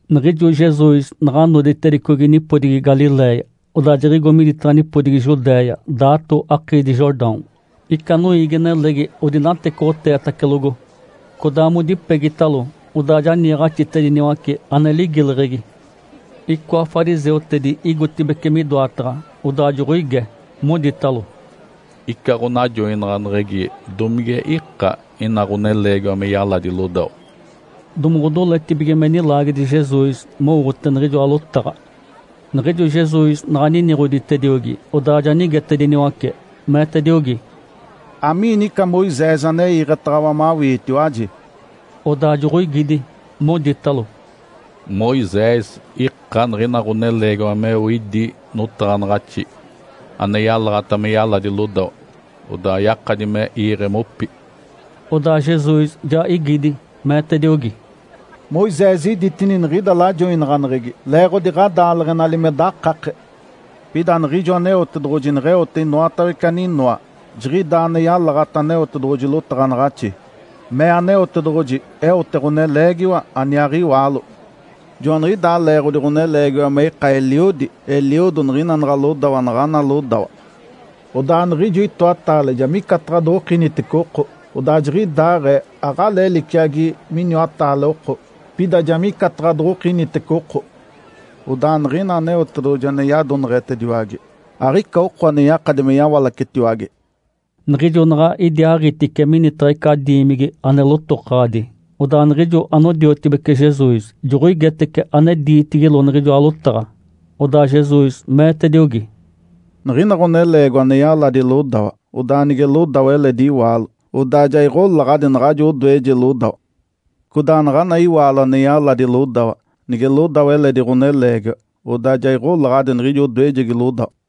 Niɡ̶ijo Jesus naɡ̶a noditedicogi nipodigi Galiléia, odaa jiɡ̶igo miditaɡ̶a nipodigi Judéia, daato akiidi Jordão. Ica noiigi-nelegi odinatecoɡ̶oteetacelogo, codaa modipegitalo, odaa ja niiɡ̶axitacediniwace, ane ligileɡ̶egi. Icoa fariseutedi igotibeci midoataɡ̶a, odaa joɡ̶oige, moditalo, “Ica ɡ̶onajoinaɡ̶aneɡ̶egi domige ika ina ɡ̶oneleegiwa me yaladi lodawa?” Domoɡ̶odoletibige me nilaagedi Jesus mowote niɡ̶ijoa lotaɡ̶a. Niɡ̶ijo Jesus naɡ̶a niniɡ̶oditediogi, odaa ja nigetediniwace, meetediogi, “Amiini ica Moisés ane iiɡ̶etaɡ̶awa mawiitiwaji?” Odaa joɡ̶oigidi, moditalo, “Moisés ika niɡ̶ina ɡ̶oneleegiwa meo idí notaɡ̶anaɡ̶axi ane yalaɡ̶ata me yaladi lodawa, odaa yakadi me iiɡ̶e mopi.” Odaa Jesus ja igidi, meetediogi, “Moisés iditini niɡ̶ida lajoinaɡ̶aneɡ̶egi leeɡ̶odi ɡ̶adaaleɡ̶enali me dakake. Pida niɡ̶ijo Aneotedoɡ̶oji neɡ̶eote inoatawece aninoa, jiɡ̶idaa ane yalaɡ̶ata Aneotedoɡ̶oji lotaɡ̶anaɡ̶axi, mee, ‘Aneotedoɡ̶oji eote ɡ̶oneleegiwa aniaaɡ̶iwaalo. Joaniɡ̶idaa leeɡ̶odi ɡ̶oneleegiwa me ika eliodi, eliodo niɡ̶ina naɡ̶a lodawa naɡ̶ana lodawa. Odaa niɡ̶ijo itoataale ja micataɡ̶a doɡ̶okinitece oko.’ Odaa jiɡ̶idaaɡ̶ee aɡ̶alee liciagi miniwataale oko, pida ja micataɡ̶a doɡ̶okinitece oko. Odaa niɡ̶ina Aneotedoɡ̶oji ane yadoneɡ̶etediwage, aɡ̶ica oko ane yakadi me yawalacetiwage.” Niɡ̶ijo naɡ̶a idiaaɡ̶itice minitaɡ̶a ica diimigi ane lotokaɡ̶adi, odaa niɡ̶ijo anodiotibece Jesus joɡ̶oigetece ane diitigilo niɡ̶ijoa lotaɡ̶a. Odaa Jesus meetediogi, “Niɡ̶ina ɡ̶oneleegiwa ane yaladi lodawa, odaa nige lodawa eledi iwaalo, odaa ja iɡ̶olaɡ̶adi naɡ̶ajo odoeje lodawa. Codaa naɡ̶ana iwaalo ane yaladi lodawa, nige lodawa eledi ɡ̶oneleegiwa, odaa ja iɡ̶olaɡ̶adi niɡ̶ijo odoejegi lodawa.”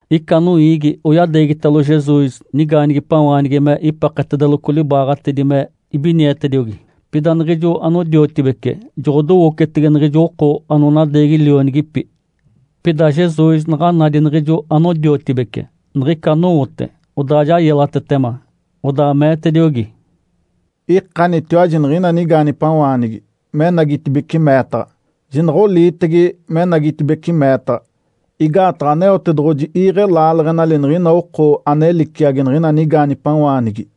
Ica noiigi oyadeegitalo Jesus nigaanigipawaanigi me ipeketedeloco libaaɡ̶atedi me ibinietediogi. Pida niɡ̶ijo anodiotibece joɡ̶odowocetege niɡ̶ijo oko anonadeegi lionigipi. Pida Jesus naɡ̶a nadi niɡ̶ijo anodiotibece niɡ̶ica anowote, odaa ja yelatetema, odaa meetediogi, “Ikanitiwaji niɡ̶ina nigaanigipawaanigi menagitibeci meetaɡ̶a, jinaɡ̶a oliitege menagitibeci meetaɡ̶a, igaataɡ̶a Aneotedoɡ̶oji iiɡ̶e laaleɡ̶enali niɡ̶ina oko ane liciagi niɡ̶ina nigaanigipawaanigi.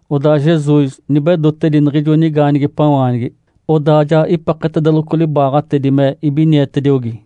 Odaa Jesus nibedotedi niɡ̶ijo nigaanigipawaanigi, odaa ja ipeketedeloco libaaɡ̶atedi me ibinietediogi.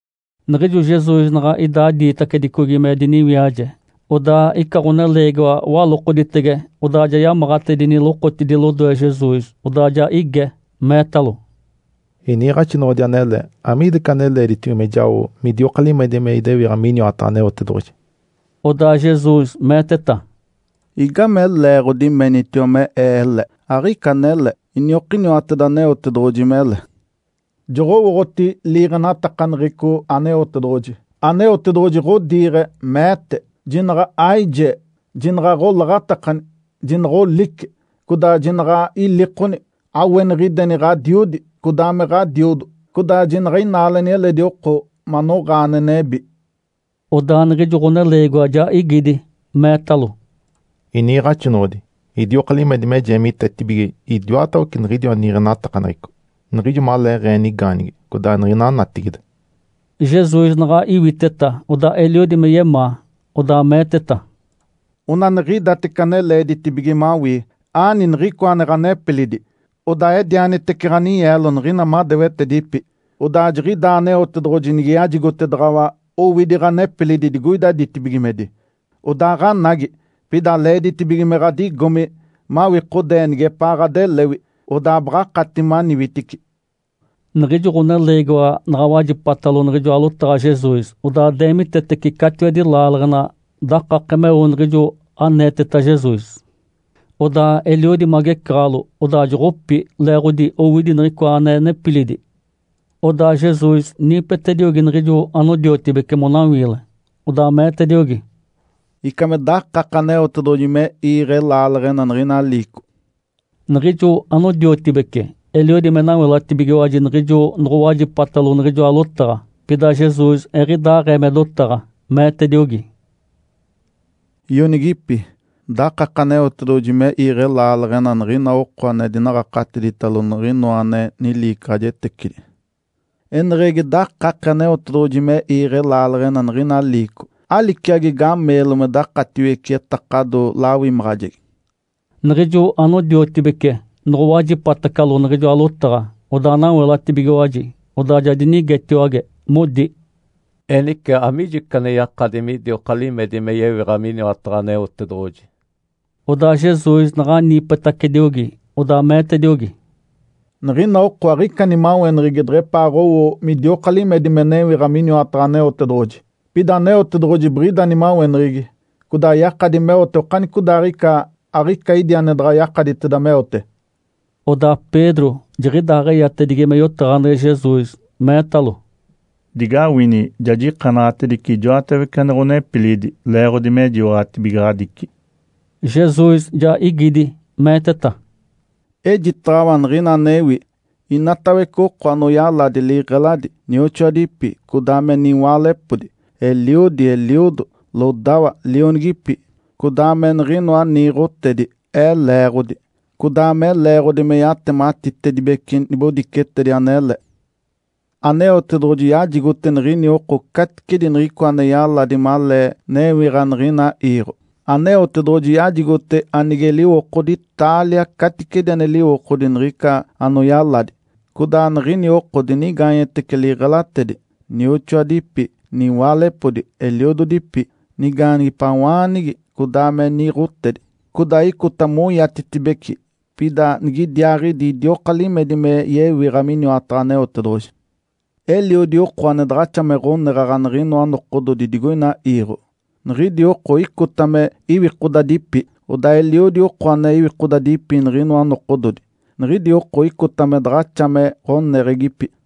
Niɡ̶ijo Jesus naɡ̶a idaa diitacedicogi me diniwiaje, odaa ica ɡ̶oneleegiwa walokoditege, odaa ja yamaɡ̶atedi lokotidi lodoe Jesus. Odaa ja ige, meetalo, “Iniiɡ̶axinoɡ̶odi anele, amiida ica ane leeditibige me jao midioka limedi me idewiɡ̶a miniwataɡ̶a Aneotedoɡ̶oji?” Odaa Jesus meeteta, “Igame leeɡ̶odi menitiwa me Ee ele? Aɡ̶ica anele, iniokiniwateda Aneotedoɡ̶oji mele. Joɡ̶owooɡ̶oti liiɡ̶enatakaneɡ̶eco Aneotedoɡ̶oji. Aneotedoɡ̶oji ɡ̶odiiɡ̶e, meete, ‘Jinaɡ̶a aijee, jinaɡ̶a aɡ̶olaɡ̶atakani, jinaɡ̶a olice, codaa jinaɡ̶a ilikoni. Aweniɡ̶ideni ɡ̶adiodi, codaa me ɡ̶adiodo.’ Codaa jinaɡ̶a inaaleni eledi oko manoɡ̶aa ane nebi.” Odaa niɡ̶ijo ɡ̶oneleegiwa ja igidi, meetalo, “Iniiɡ̶axinoɡ̶odi, idioka limedi me jeemitetibige idiwatawece niɡ̶idiwa niiɡ̶enatakaneɡ̶eco niɡ̶ijo maleeɡ̶ee nigaanigi codaa niɡ̶ina natigide.” Jesus naɡ̶a iwiteta, odaa eliodi me yemaa, odaa meeteta, “Onaniɡ̶idatece ane leeditibige mawii. Aani niɡ̶icoa ane ɡ̶anepilidi, odaa edianitece ɡ̶aninyeelo niɡ̶ina madewetedipi. Odaa jiɡ̶idaa Aneotedoɡ̶oji nige yajigotedaɡ̶awa owidi ɡ̶anepilidi digoida ditibigimedi. Odaaɡ̶anagi, pida leeditibige me ɡ̶adigomi mawikodee nigepaa ɡ̶adelewi, odaa baɡ̶akati maniwitici.” Niɡ̶ijo ɡ̶oneleegiwa naɡ̶a wajipatalo niɡ̶ijoa lotaɡ̶a Jesus, odaa deemitetece catiwedi laaleɡ̶ena dakake meo niɡ̶ijo aneeteta Jesus. Odaa eliodi magecaɡ̶alo, odaa joɡ̶opi, leeɡ̶odi owidi niɡ̶icoa ane nepilidi. Odaa Jesus niipetediogi niɡ̶ijo anodiotibece monawiile, odaa meetediogi, “Ica me dakake Aneotedoɡ̶oji me iiɡ̶e laaleɡ̶ena niɡ̶ina liico!” Niɡ̶ijo anodiotibece eliodi me nawelatibigiwaji niɡ̶ijo noɡ̶owajipatalo niɡ̶ijoa lotaɡ̶a. Pida Jesus eɡ̶idaaɡ̶ee me dotaɡ̶a, meetediogi, “Ionigipi, dakake Aneotedoɡ̶oji me iiɡ̶e laaleɡ̶ena niɡ̶ina oko ane dinaɡ̶akatiditalo niɡ̶ina ane niliicaɡ̶ajetecidi! Eneɡ̶egi dakake Aneotedoɡ̶oji me iiɡ̶e laaleɡ̶ena niɡ̶ina liico, aliciagi gameelo me dakatiwece etakado lawimaɡ̶ajegi.” Niɡ̶ijo anodiotibece noɡ̶owajipatacalo niɡ̶ijoa lotaɡ̶a, odaa nawelatacibigiwaji. Odaa ja dinigetiwage, modi, “Enice, amigijo ica ane yakadi midioka limedi me yewiɡ̶a miniwataɡ̶a Aneotedoɡ̶oji?” Odaa Jesus naɡ̶a niipetacediogi, odaa meetediogi, “Niɡ̶ina oko aɡ̶ica nimaweneɡ̶egi deɡ̶epaaɡ̶owo midioka limedi me newiɡ̶a miniwataɡ̶a Aneotedoɡ̶oji, pida Aneotedoɡ̶oji biɡ̶ida nimaweneɡ̶egi. Codaa yakadi meote okanicodaaɡ̶ica, aɡ̶ica idi ane daɡ̶a yakaditeda meote.” Odaa Pedro jiɡ̶idaaɡ̶eyatedigi me yotaɡ̶aneɡ̶e Jesus, meetalo, “Digawini! Ja jikanaɡ̶atedice ijoatawece ane ɡ̶onepilidi leeɡ̶odi me jiwaɡ̶atibigaɡ̶adici.” Jesus ja igidi, meeteta, “Ejitaɡ̶awa niɡ̶ina anewi. Inatawece oko anoyaladi liɡ̶eladi, nioxoadipi, codaa me niwaalepodi, eliodi, eliodo, lodawa, lionigipi, codaa me niɡ̶inoa niiɡ̶otedi Ee leeɡ̶odi, codaa me leeɡ̶odi me yatematitedibece nibodicetedi anele, Aneotedoɡ̶oji yajigote niɡ̶ini oko caticedi niɡ̶icoa ane yaladi malee newiɡ̶a niɡ̶ina iiɡ̶o. Aneotedoɡ̶oji yajigote anige liwokodi taalia caticedi ane liwokodi niɡ̶ica anoyaladi. Codaa niɡ̶ini oko dinigaanyetece liɡ̶elatedi, nioxoadipi, niwaalepodi, eliododipi, nigaanigipawaanigi, codaa me niiɡ̶otedi. Codaa icota moiatetibeci, pida nigidiaaɡ̶idi idioka limedi me yewiɡ̶a miniwataɡ̶a Aneotedoɡ̶oji. Eliodi oko ane daɡ̶axa me ɡ̶oneɡ̶aɡ̶a niɡ̶inoa nokododi digoina iiɡ̶o, niɡ̶idi oko icota me iwikodadipi. Odaa eliodi oko ane iwikodadipi niɡ̶inoa nokododi, niɡ̶idi oko icota me daɡ̶axa me ɡ̶oneɡ̶egipi.”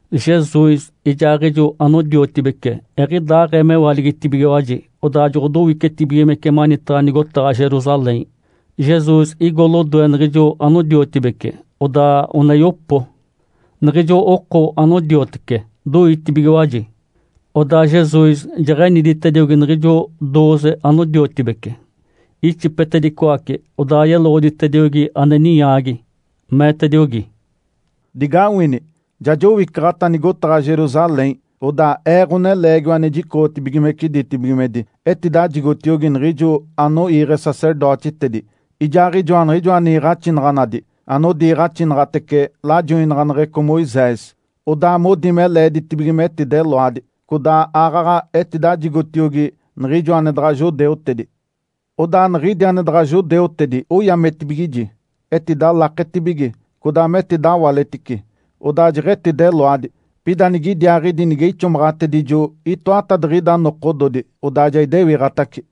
Jesus ijaaɡ̶ijo anodiotibece eɡ̶idaaɡ̶ee mewaligitibigiwaji, odaa joɡ̶odowicetibigimece manitaɡ̶a nigotaɡ̶a Jerusalém. Jesus igo lodoe niɡ̶ijo anodiotibece odaa one oyopo. Niɡ̶ijo oko anodiotece doitibigiwaji. Odaa Jesus jeɡ̶eniditediogi niɡ̶ijo dooze anodiotibece, ixipetedicoace. Odaa yeloɡ̶oditediogi ane ninyaagi. Meetediogi, “Digawini! Ja jowicaɡ̶ata nigotaɡ̶a Jerusalém. Odaa Ee, Ǥoneleegiwa ane jicoɡ̶otibigimece ditibigimedi etidajigotiogi niɡ̶ijo anoiiɡ̶e sacerdotitedi, ijaaɡ̶ijoa niɡ̶ijoa niiɡ̶axinaɡ̶anadi anodiiɡ̶axinaɡ̶atece lajoinaɡ̶aneɡ̶eco Moisés. Odaa modi me leeditibige metideloadi, codaa aaɡ̶aɡ̶a etidajigotiogi niɡ̶ijo ane daɡ̶a judeutedi. Odaa niɡ̶idi ane daɡ̶a judeutedi oyametibigiji, etidalaketibige, codaa metidawaletice, odaa jeɡ̶etideloadi. Pida nigidiaaɡ̶idi nige ixomaɡ̶atedijo itoatadiɡ̶ida nokododi, odaa ja idewiɡ̶atace.”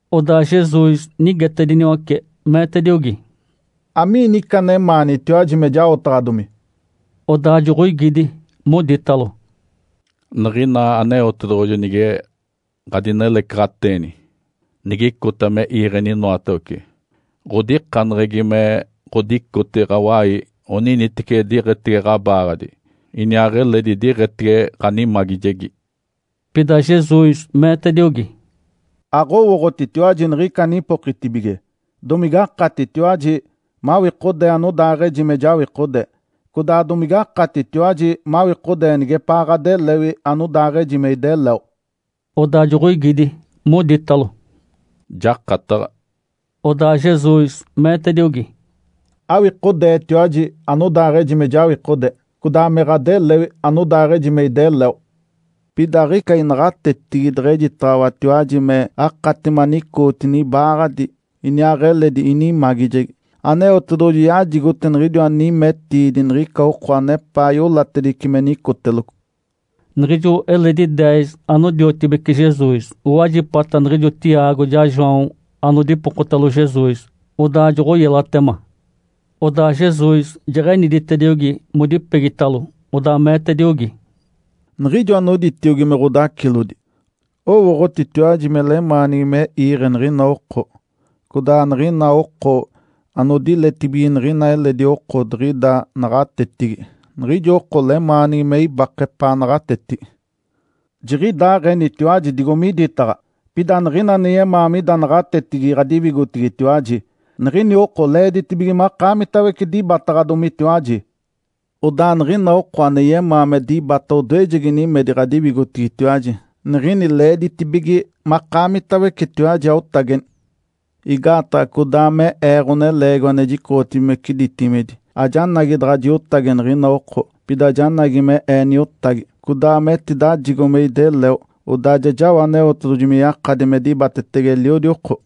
Odaa Jesus nigetediniwace, meetediogi, “Amiini ica anemaanitiwaji me jaotaɡ̶adomi?” Odaa joɡ̶oigidi, moditalo, “Niɡ̶ina Aneotedoɡ̶oji nige ɡ̶adinelecaɡ̶ateeni, nigicota me iiɡ̶eni inoatawece, ɡ̶odikaneɡ̶egi me ɡ̶odicote ɡ̶awai oniniteci diɡ̶etege ɡ̶abaaɡ̶adi iniaaɡ̶eledi diɡ̶etege ɡ̶animagijegi.” Pida Jesus meetediogi, “Aɡ̶owooɡ̶otitiwaji niɡ̶ica anipokitibige. Domigakatitiwaji mawikodee anodaaɡ̶eji me jawikode, codaa domige akatitiwaji mawikodee nigepaa ɡ̶adelewi anodaaɡ̶eji me ideleo?” Odaa joɡ̶oigidi, moditalo, “Jakataɡ̶a!” Odaa Jesus meetediogi, “Awikodeetiwaji anodaaɡ̶eji me jawikode, codaa me ɡ̶adelewi, anodaaɡ̶eji me ideleo. Pida aɡ̶ica inaɡ̶atetigi deɡ̶ejitaɡ̶awatiwaji me akati manicootini ibaaɡ̶adi, iniaaɡ̶eledi inimagijegi. Aneotedoɡ̶oji yajigote niɡ̶idiwa nimetiidi niɡ̶ica oko anepaa iolatedice me nicoteloco.” Niɡ̶ijo eledi deez anodiotibece Jesus owajipata niɡ̶ijo Tiago ijaa João anodipokotalo Jesus, odaa joɡ̶oyelatema. Odaa Jesus jeɡ̶eniditediogi modipegitalo, odaa meetediogi, “Niɡ̶ijo anoditiogi me ɡ̶odacilodi, owooɡ̶otitiwaji me lemaanigi me iiɡ̶e niɡ̶ina oko, codaa niɡ̶ina oko anodiletibige niɡ̶ina eledi oko diɡ̶ida naɡ̶atetigi, niɡ̶ijo oko lemaanigi me ibake epaanaɡ̶a naɡ̶atetigi. Jiniɡ̶idaaɡ̶enitiwaji digo miditaɡ̶a. Pida niɡ̶ina ane yemaa mida naɡ̶atetigi ɡ̶adiwigotigitiwaji, niɡ̶ini oko leeditibige makaamitawece dibataɡ̶adomitiwaji. Odaa niɡ̶ina oko ane yemaa me dibata odoejegi nimedi ɡ̶adiwigotigitiwaji, niɡ̶ini leeditibige makaamitawecetiwaji aotageni. Igaataɡ̶a codaa me Ee, Ǥoneleegiwa ane jicoɡ̶otibigimece ditibigimedi, ajanagi daɡ̶a jiotage niɡ̶ina oko, pida janagi me Ee niotagi, codaa me etidajigo me ideleo, odaa ja jao Aneotedoɡ̶oji me yakadi me dibatetege eliodi oko.”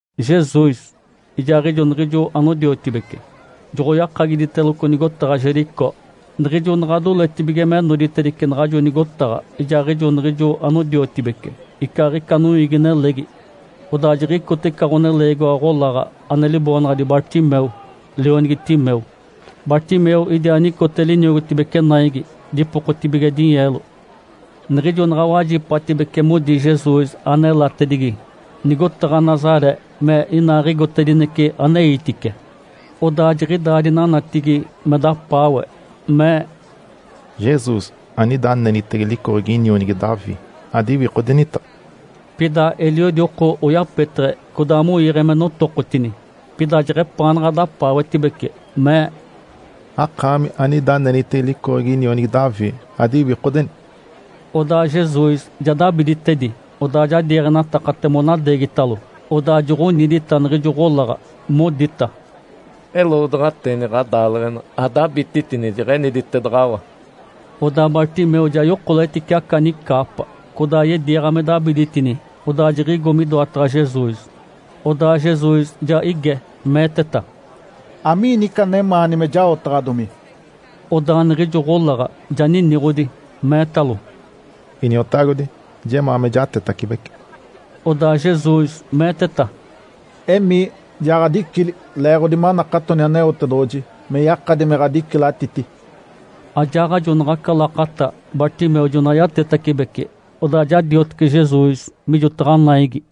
Jesus ijaaɡ̶ijo niɡ̶ijo anodiotibece joɡ̶oyakagiditeloco nigotaɡ̶a Jericó. Niɡ̶ijo naɡ̶a doletibige me noditedice naɡ̶ajo nigotaɡ̶a, ijaaɡ̶ijo niɡ̶ijo anodiotibece icaaɡ̶ica noiigi-nelegi, odaa jiɡ̶icote ica ɡ̶oneleegiwa ɡ̶olaɡ̶a ane liboonaɡ̶adi Bartimeu, lionigi Timeu. Bartimeu idiaa nicote liniogotibece naigi, dipokotibige dinyeelo. Niɡ̶ijo naɡ̶a wajipatibece modi Jesus anelatedigi nigotaɡ̶a Nazaré me inaaɡ̶igotedinece aneitice, odaa jiɡ̶idaa dinanatigi me dapaawe, mee, “Jesus, anida anenitege licoɡ̶egi inionigi Davi, adiwikodenita!” Pida eliodi oko oyapeteɡ̶e, codaa moiiɡ̶e me notokotini. Pida jeɡ̶epaanaɡ̶a dapaawetibece, mee, “Akaami, anida anenitege licoɡ̶egi inionigi Davi, adiwikodeni!” Odaa Jesus ja dabiditedi, odaa ja diiɡ̶enatakate monadeegitalo. Odaa joɡ̶onidita niɡ̶ijo ɡ̶olaɡ̶a, modita, “Eloodaɡ̶ateeni ɡ̶adaaleɡ̶ena! Adabititini! Jeɡ̶eniditedaɡ̶awa.” Odaa Bartimeu ja yokoletice aca nicaapa, codaa yediiɡ̶a me dabiditini, odaa jiɡ̶igo midoataɡ̶a Jesus. Odaa Jesus ja ige, meeteta, “Amiini ica anemaani me jaotaɡ̶adomi?” Odaa niɡ̶ijo ɡ̶olaɡ̶a ja niniɡ̶odi, meetalo, “Iniotagodi, jemaa me jatetacibece.” Odaa Jesus meeteta, “Emii, ja ɡ̶adicili leeɡ̶odi manakatoni Aneotedoɡ̶oji me yakadi me ɡ̶adicilatiti.” Ajaaɡ̶ajo naɡ̶aca lakata Bartimeu jona yatetacibece, odaa ja diotece Jesus mijotaɡ̶a naigi.